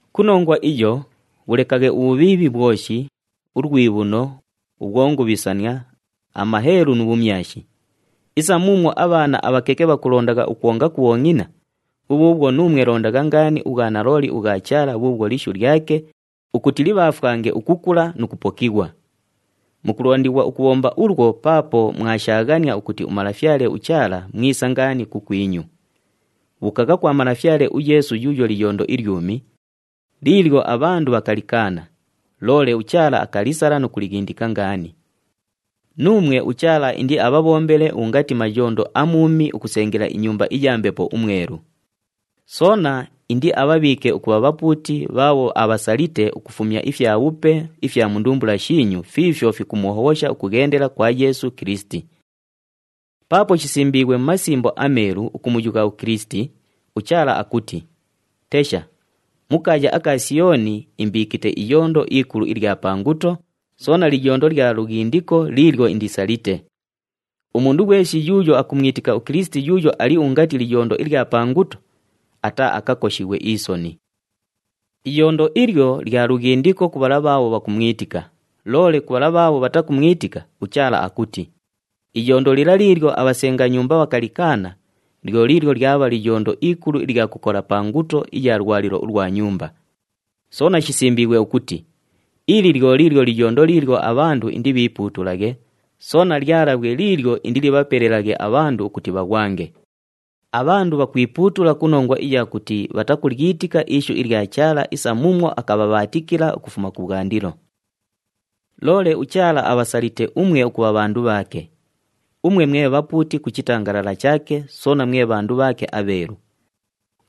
Ku nongwa iyo, bhulekaghe ubhubhiibhi bhwoshi, ulwibhuno, ubhwongubhisania, amaheelu nu bhumyashi. Isa muumwo abhaana abhakeke bhakulondagha ukwonga ku bhongʼina, bhubhuubhwo nuumwe londagha ngaani ubhwanalooli ubhwa Chaala bhuubhwo lishu lyake ukuti libhaafwange ukukula nu kupokighwa. Mukulondighwa ukubhomba ulwo paapo mwashaaghania ukuti uMalafyale uChaala mwisa ngaani kukwinyu. Bhuukagha kwa Malafyale uYeesu yuuyo liyondo ilyumi, liilyo abhandu bhakalikaana, loole uChaala akalisala nu kulighindika ngaani. Nuumwe uChaala indiabhabhombele ungati mayondo amuumi ukusengela inyumba iya Mbepo uMwelu. Soona indiabhabhiike ukubha bhapuuti bhaabho abhasalite ukufumya ifyabhupe ifya ndumbula shiinyu fiifyo fikumuhobhosha ukughendela kwa Yeesu Kilisiti. Paapo shisimbiighwe mu Masimbo aMeelu ukumuyugha uKilisiti, uChaala akuti, “Tesha, mu kaaya aka Siyooni, imbiikite iyondo ikulu ilya pa nguto, soona liyondo lya lughindiko liilyo indisalite. Umundu ghweshi yuuyo akumwitika uKilisiti yuuyo ali ungati liyondo ilya pa nguto, ataaakakoshighwe isoni.” Iyondo ilyo lya lughindiko ku bhala bhaabho bhakumwitika, loole ku bhala bhaabho bhatakumwitika, uChaala akuti, “Iyondo lila liilyo abhasenga nyumba bhakalikaana, lyo liilyo lyabha liyondo ikulu ilya kukola pa nguto iya lwalilo ulwa nyumba.” Soona shisimbiighwe ukuti, “Ili lyo liilyo liyondo liilyo abhandu indibhiipuutulaghe, soona lyalabhwe liilyo indilibhapelelaghe abhandu ukuti bhaghwange.” Abhandu bhakwipuutula ku nongwa iya kuti bhatakulyitika ishu ilya Chaala isa muumwo akabhabhaatikila ukufuma kubhwandilo. Loole uChaala abhasalite umwe ukubha bhandu bhaake. Umwe mwe bhapuuti ku chitangalala chaake, soona mwe bhandu bhaake abheelu.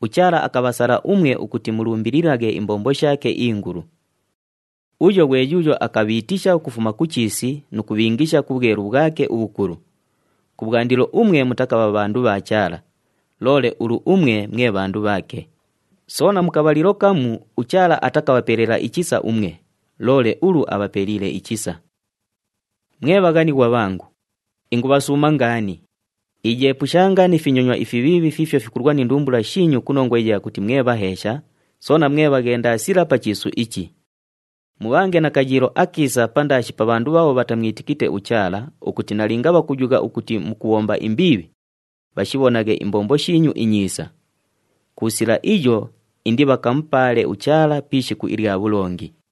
UChaala akabhasala umwe ukuti mulumbililaghe imbombo shaake ingulu. Uyo ghwe yuuyo akabhiitisha ukufuma ku chiisi nu kubhiingisha ku bhwelu bhwake ubhukulu. Kubhwandilo umwe mutakabha bhandu bha Chaala, loole ulu umwe mwe bhandu bhaake. Soona mu kabhalilo kamu uChaala atakabhapelela ichisa umwe, loole ulu abhapeliile ichisa. Mwe bhaghanighwa bhangu, ingubhasuuma ngaani, iyeepushanga ni finyonywa ifibhiibhi fiifyo fikulwa ni ndumbula shiinyu ku nongwa iya kuti mwe bhaheesha, soona mwe bhaghendasila pa chiisu ichi. Mubhange na kayiilo akiisa pandaashi pa bhandu bhaabho bhatamwitikite uChaala ukuti nalinga bhakuyugha ukuti mukubhomba imbiibhi, bhashibhonaghe imbombo shiinyu inyiisa. Ku sila iyo indibhakamupaale uChaala pi ishiku ilya bhulongi.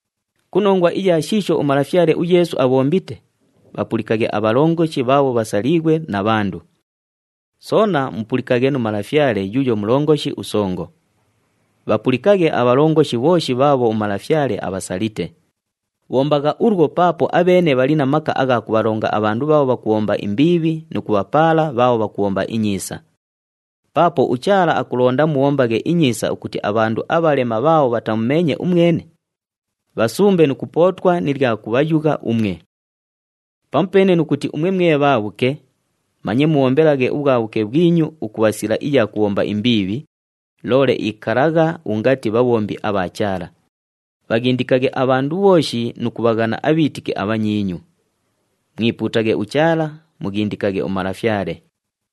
Ku nongwa iya shiisho uMalafyale uYeesu abhombite, bhapulikaghe abhalongoshi bhaabho bhasaliighwe na bhandu. Soona mupulikaghe nu malafyale yuuyo mulongoshi usongo. Bhapulikaghe abhalongoshi bhooshi bhaabho umalafyale abhasalite. Bhombagha ulwo paapo abheene bhali na maka agha kubhalonga abhandu bhaabho bhakubhomba imbiibhi nu kubhapaala bhaabho bhakubhomba inyiisa. Paapo uChaala akulonda mubhombaghe inyiisa ukuti abhandu abhalema bhaabho bhatamumeenye umwene, bhasumbe nu kupootwa ni lya kubhayugha umwe. Pamupeene nu kuti umwe mwe bhaabhuke, manye mubhombelaghe ubhwabhuke bhwinyu ukubha sila iya kubhomba imbiibhi, loole ikalagha ungati bhabhombi abha Chaala. Bhaghindikaghe abhandu bhooshi nu kubhaghana abhiitiki abhanyiinyu. Mwipuutaghe uChaala, mughindikaghe umalafyale.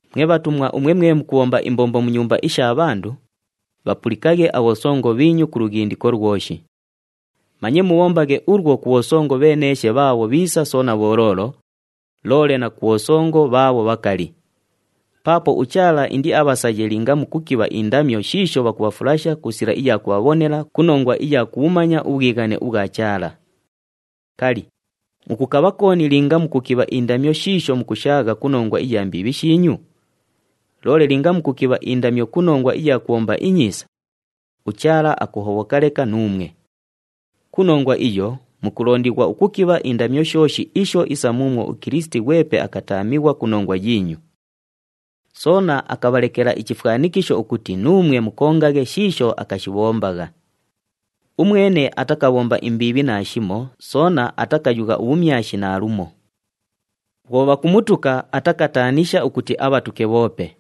Mwe bhatumwa umwe mwe mukubhomba imbombo mu nyumba isha bhandu, bhapulikaghe abhosongo bhiinyu ku lughindiko lwoshi. Manye mubhombaghe ulwo ku bhosongo bheeneeshe bhaabho bhiisa soona bholoolo, loole na ku bhosongo bhaabho bhakali. Paapo uChaala indiabhasaye linga mukukibha indamyo shiisho bhakubhafulasha ku sila iya kubhabhonela ku nongwa iya kubhumanya ubhwighane ubhwa Chaala. Kali, mukukabha kooni linga mukukibha indamyo shiisho mukushaagha ku nongwa iya mbiibhi shiinyu? Loole linga mukukibha indamyo ku nongwa iya kubhomba inyiisa, uChaala akuhobhoka leka nuumwe. Ku nongwa iyo mukulondighwa ukukibha indamyo shooshi isho isa muumwo uKilisiti ghwepe akataamighwa ku nongwa yiinyu. Soona akabhalekela ichifwanikisho ukuti nuumwe mukongaghe shiisho akashibhombagha. Umwene atakabhomba imbiibhi naashimo soona atakayugha ubhumyashi naalumo. Bhwo bhakumutuka, atakataanisha ukuti abhatuke bhoope.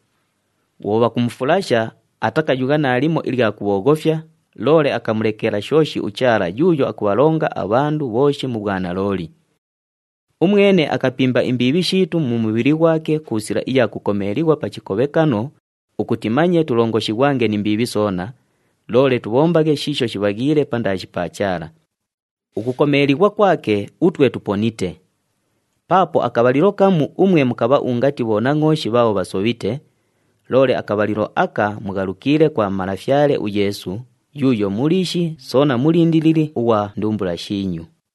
Bhwo bhakumufulasha, atakayugha naalimo ilya kubhooghofya, loole akamulekela shooshi uChaala yuuyo akubhalonga abhandu bhooshi mu bhwanalooli. Umwene akapimba imbiibhi shiitu mu mubhili ghwake ku sila iya kukomeelighwa pa chikobhekano ukuti manye tulongoshighwange ni mbiibhi soona, loole tubhombaghe shiisho shibhaghiile pandaashi pa Chaala. Ukukomeelighwa kwake, utwe tuponite. Paapo akabhalilo kamu umwe mukabha ungati bhonangʼooshi bhaabho bhasobhite, loole akabhalilo aka mughalukiile kwa Malafyale uYeesu yuuyo Muliishi soona Mulindilili ughwa ndumbula shiinyu.